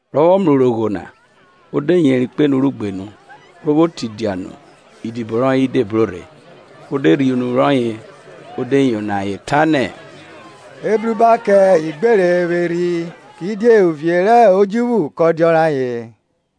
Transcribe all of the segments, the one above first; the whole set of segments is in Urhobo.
Rọ vwọ mrẹ urogho na, o de yeri kpo enu rẹ ugbenu, ro vwo tidia nu idibo rọye de bro rhe. O de rhie unu rọye o de yono ayen ta nẹ, Ebruba kẹ igbere vwẹ erhi; kidie uvie rẹ odjuvwu kọ dia ọrayen.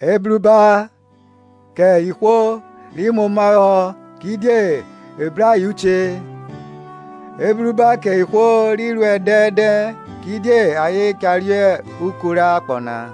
Ebruba kẹ ihwo ri muomahọ; kidie e bru ayen uche. Ebruba kẹ ihwo ri ruẹ dẹndẹn; kidie ayen cha reuku rẹ akpọ na.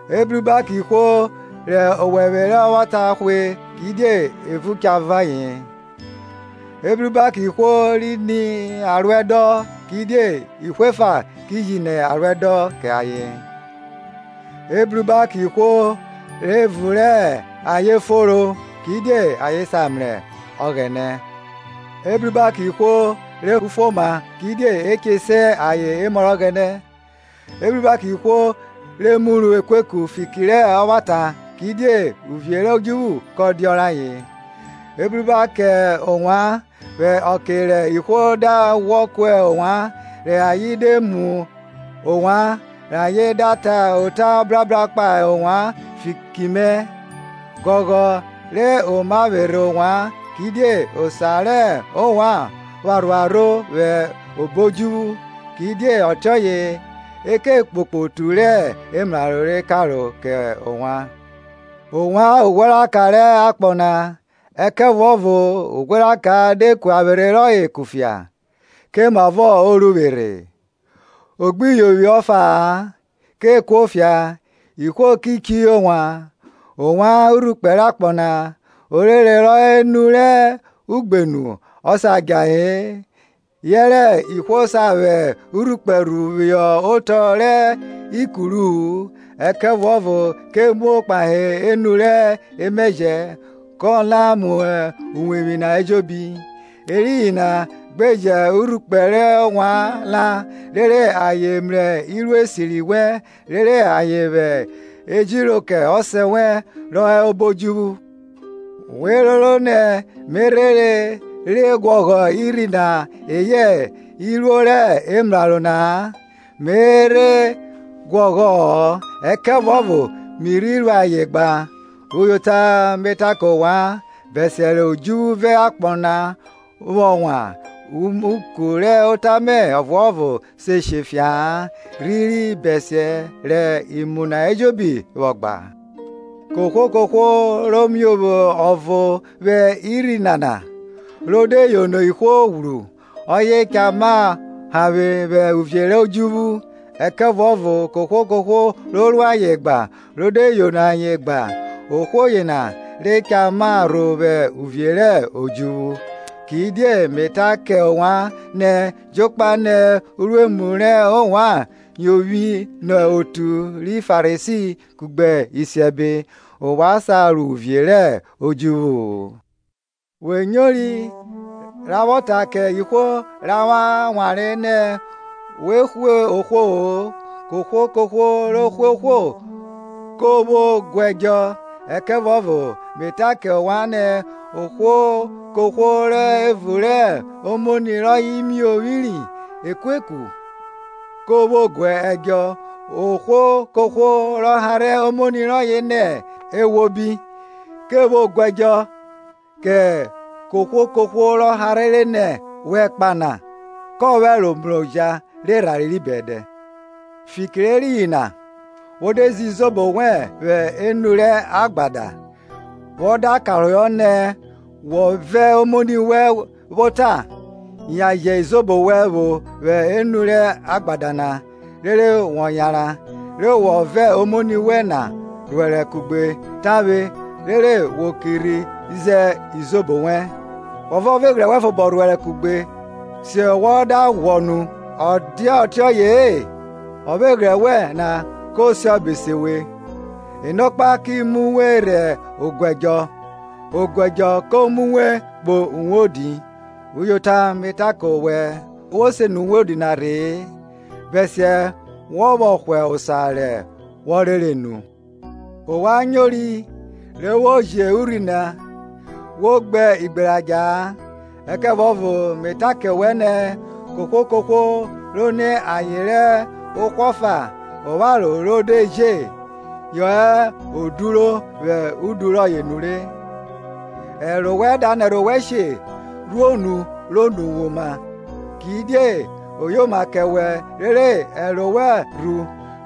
Ebruba kẹ ihwo rẹ owẹvwe rẹ ọvwata hwe; kidie evun cha vọn ayen. Ebruba kẹ ihwo ri ni aruẹdọn; kidie ihwo efa ki ji ni aruẹdọn kẹ ayen. Ebruba kẹ ihwo rẹ evun rẹ ayen fonro; kidie ayen cha mrẹ Ọghẹnẹ. Ebruba kẹ ihwo rẹ kẹ ufuoma; kidie e che se ayen emọ rẹ Ọghẹnẹ. Ebruba kẹ ihwo re muru ekueku fiki rẹ ọvwata; kidie uvie rẹ odjuvwu kọ dia ọrayen. Ebruba kẹ ovwan, vwẹ ọke rẹ ihwo da ghwọ ku ovwan, rẹ ayen de mu ovwan, rẹ ayen da ta ota ọbrabra kpahe ovwan fiki mẹ. Ghọghọ re oma vwerhe ovwan, kidie osa rẹ ovwan pha rhuarho vwẹ obo odjuvwu; kidie ọtiọye e ke kpokpo otu rẹ emraro re karo kẹ ovwan. Ovwan ughweraka rẹ akpọ na. Ẹkẹvuọvo ughweraka de ku avwerhe rọye kufia, komavọ o ru vwerhe? o gbi yovwi ọfa-a, ke kuo kufia, ihwo ki chiyo wan. Ovwan urhukpẹ rẹ akpọ na. Orere rọ hẹ enu rẹ ugbenu ọ sa djahe-e. Yẹrẹ ihwo sa vwẹ urhukpẹ rhu phihọ otọ rẹ ikuru-u, ẹkẹvuọvo ke muo kpahe enu rẹ emẹjẹ, kọ la mu uwevwi na ejobi. Eriyin na gbe jẹ urhukpẹ wẹn la vwọ kẹ ihwo, rere ayen mrẹ iruo esiri wẹn rere ayen vwẹ ejiro kẹ ọsẹ wẹn rọ hẹ obo odjuvwu. We roro nẹ me rhere rhe guọghọ irhi na eyẹ iruo rẹ emraro na-a, me rhere guọghọ-ọ, ẹkẹvuọvo mi rhi ru ayen gba. Uyota me ta kẹ ovwan, bẹsiẹ rẹ odjuvwu vẹ akpọ vwọ wan, umuku rẹ ota mẹ ọvuọvo se she fia-a, rhiri bẹsiẹ rẹ imu na ejobi vwọ gba, Kohwo kohwo ro miovwo ọvo vwẹ irhi nana, ro de yono ihwo ghwru, ọye cha ma hanvwe vwẹ uvie rẹ odjuvwu; ẹkẹvuọvo kohwo kohwo ro ru ayen gba ro de yono ayen gba, ohwo yena re cha ma rho vwẹ uvie rẹ odjuvwu. Kidie me ta kẹ ovwan nẹ, jokpa nẹ uruemu rẹ ovwan yovwi nọ otu ri Farisi kugbe isiẹbe na-a, ovwan sa ro uvie rẹ odjuvwu-u. We nyori ra vwọ ta kẹ ihwo rẹ awanre nẹ, wo hwe ohwo-o, kohwo kohwo ro hwe ohwo ke vwo gu ẹdjọ. Ẹkẹvuọvo me ta kẹ ovwan nẹ, ohwo kohwo rẹ evun rẹ omoni rọye miovwiri ekueku, ke vwo gu ẹdjọ; ohwo kohwo ro harhe omoni rọye nẹ, Eghwobi, ke vwo guẹdjọ kẹ ukoko rẹ ihwo, ohwo rọ harhere nẹ, Wẹ ẹkpa na, kọ vwẹ ẹro siẹn oja rẹ erhanre ri bẹdẹ. Fiki rẹ eriyin na, wo de ze izobo wẹn vwẹ enu rẹ agbada, wọ da karohọ nẹ wọ vẹ omoni wẹ vwo ota, yan je izobo wẹn vwo vwẹ enu rẹ agbada na, rere wọ yanran, re wọ vẹ omoni wẹ na rhuẹrẹ kugbe tavwe rere wo ki rhi ze izobo wẹn. Wọ vẹ ọvweghre wẹn fobo rhuẹrẹ kugbe siẹ wọ da ghwọ nu; ọ dia ọtiọye-e, ọvweghrẹ wẹn na ko siọbe se we, enọkpa ki mu we rhe oguẹdjọ, oguẹdjọ ko mu we kpo uwodi; Uyota me ta kẹ wẹ, wo se nẹ uwodi na rhe-e, bẹsiẹ wọ vwọ hwa osa re wọ rere nu. Ovwan nyori re vwo ji urhi nẹ, Wo gbe igberadja-a; ẹkẹvuọvo me ta kẹ wẹ nẹ, kohwo kohwo ro ni aye rẹ ohwo ọfa opharo ro de je, yẹ o duro vwẹ udu rọye nure. Ẹro wẹn da nẹrhẹ owẹ she, rhuo nu ro nẹ uwe oma; kidie oyoma kẹ wẹ rere ẹro wẹ rhu,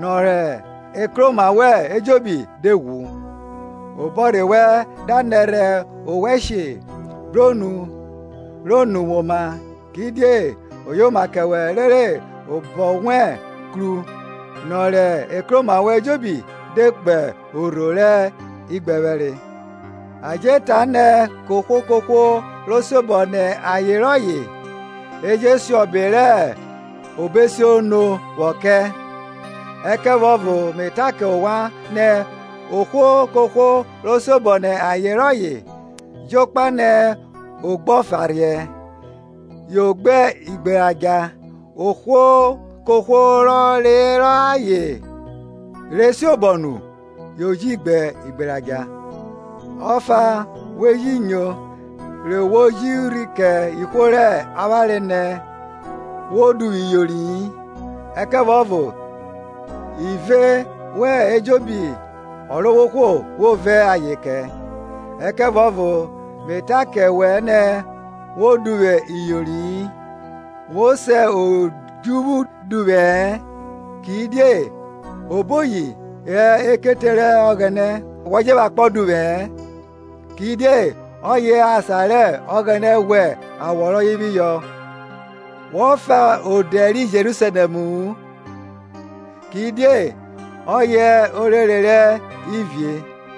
nọ rẹ ekroma wẹn ejobi de ghwru. Obọrhe wẹn da nẹrhẹ owẹ she, bro nu ro nẹ uwe oma; kidie oyoma kẹ wẹ rere obọ wẹn kru, nọ rẹ ekroma wẹn ejobi de kpo orho rẹ igbẹphẹre. A je ta nẹ, kohwo kohwo ro siobọ nẹ aye rọye, e jo siọbe rẹ obọesiono vwọ kẹ; ẹkẹvuọvo me ta kẹ ovwan nẹ, ohwo kohwo ro siobọ nẹ aye rọye, jokpa nẹ o gbe ọfarhiẹ, yo gbe igberadja; ohwo kohwo rọ reyọ aye re siobọ nu yo ji gbe igberadja. Ọfa we ji nyo re vwo ji urhi kẹ ihwo rẹ awanre nẹ, Wo duvwu iyori-i, ẹkẹvuọvo ive wẹ ejobi Ọrovwohwo wo ve ayen kẹ; ẹkẹvuọvo me ta kẹ wẹ nẹ, Wo duvwu iyori-i, wo se odjuvwu duvwẹ-ẹ, kidie oboyi hẹ ekete rẹ Ọghẹnẹ; wọ je vwẹ akpọ duvwẹ-ẹ, kidie ọye hẹ asan rẹ Ọghẹnẹ ghwẹ awọ rọyẹ phihọ; wọ fa odẹ ri Jerusalẹmu-u, kidie ọye hẹ orere rẹ Ivie.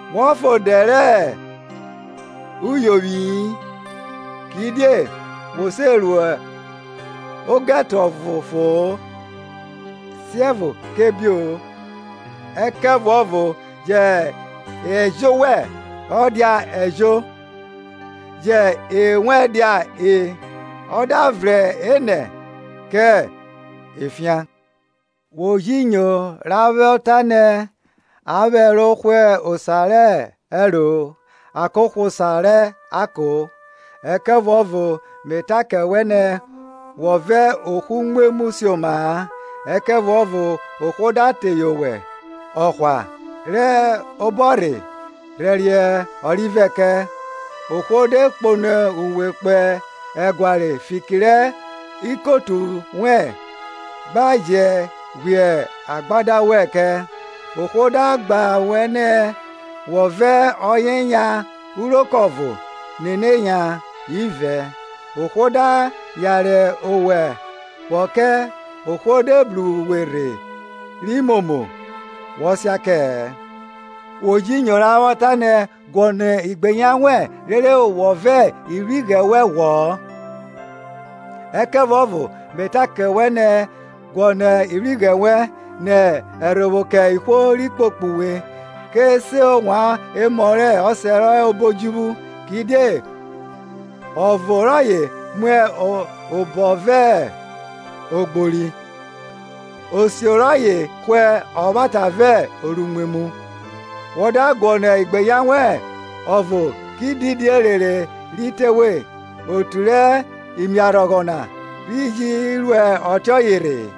Wọ fa odẹ rẹ uyovwi-i, Kidie wo se ru ogẹto ọvo fo-on, siẹvo kẹ ebio-o. Ẹkẹvuọvo jẹ Ẹjo wẹn dia Ẹjo, ji E wẹn dia E; ọ da vrẹn enẹ kẹ efian. Wo ji nyo ra vwọ ta nẹ, a vwẹ ẹro hwa osa rẹ ẹro ako hwa osa rẹ ako; ẹkẹvuọvo me ta kẹ wẹ nẹ, Wọ vẹ ohwo umwemwu sioma-a, ẹkẹvuọvo ohwo da teye owẹ ọhwa rẹ obọrhe, rhẹriẹ orivẹ kẹ. Ohwo de kpono uwe kpo ẹguare fiki rẹ ikotu wẹ, gba je ghwiẹ adagba wẹn kẹ. Ohwo da gba wẹ nẹ, wọ vẹ ọyẹ yan uroko ọvo, nene yan ivẹ. Ohwo da yare owẹ vwọ kẹ, ohwo de bru uwe rhe ri momo wọ sia kẹ-ẹ. Wo ji nyo ra vwọ ta nẹ, guọnọ igbeyan wẹn, rere wọ vẹ ivwighrẹ wẹn ghwọ. Ẹkẹvuọvo me ta kẹ wẹ nẹ, guọnọ ivwighrẹ wẹn, nẹ ẹrhovwo kẹ ihwo ri kpokpo uwe, ke se ovwan emọ rẹ ọsẹ rọ hẹ ọbo odjuvwu, kidie uvo rọye muẹ ọbo vẹ ogbori, osio rọye hwe ọvwata vẹ oruimwemwu. Wọ da guọnọ igbeyan wẹ ọvo ki didi erere ri te we? Otu rẹ imiarhọghọ na rhe ji ru ọtiọye rhe-e?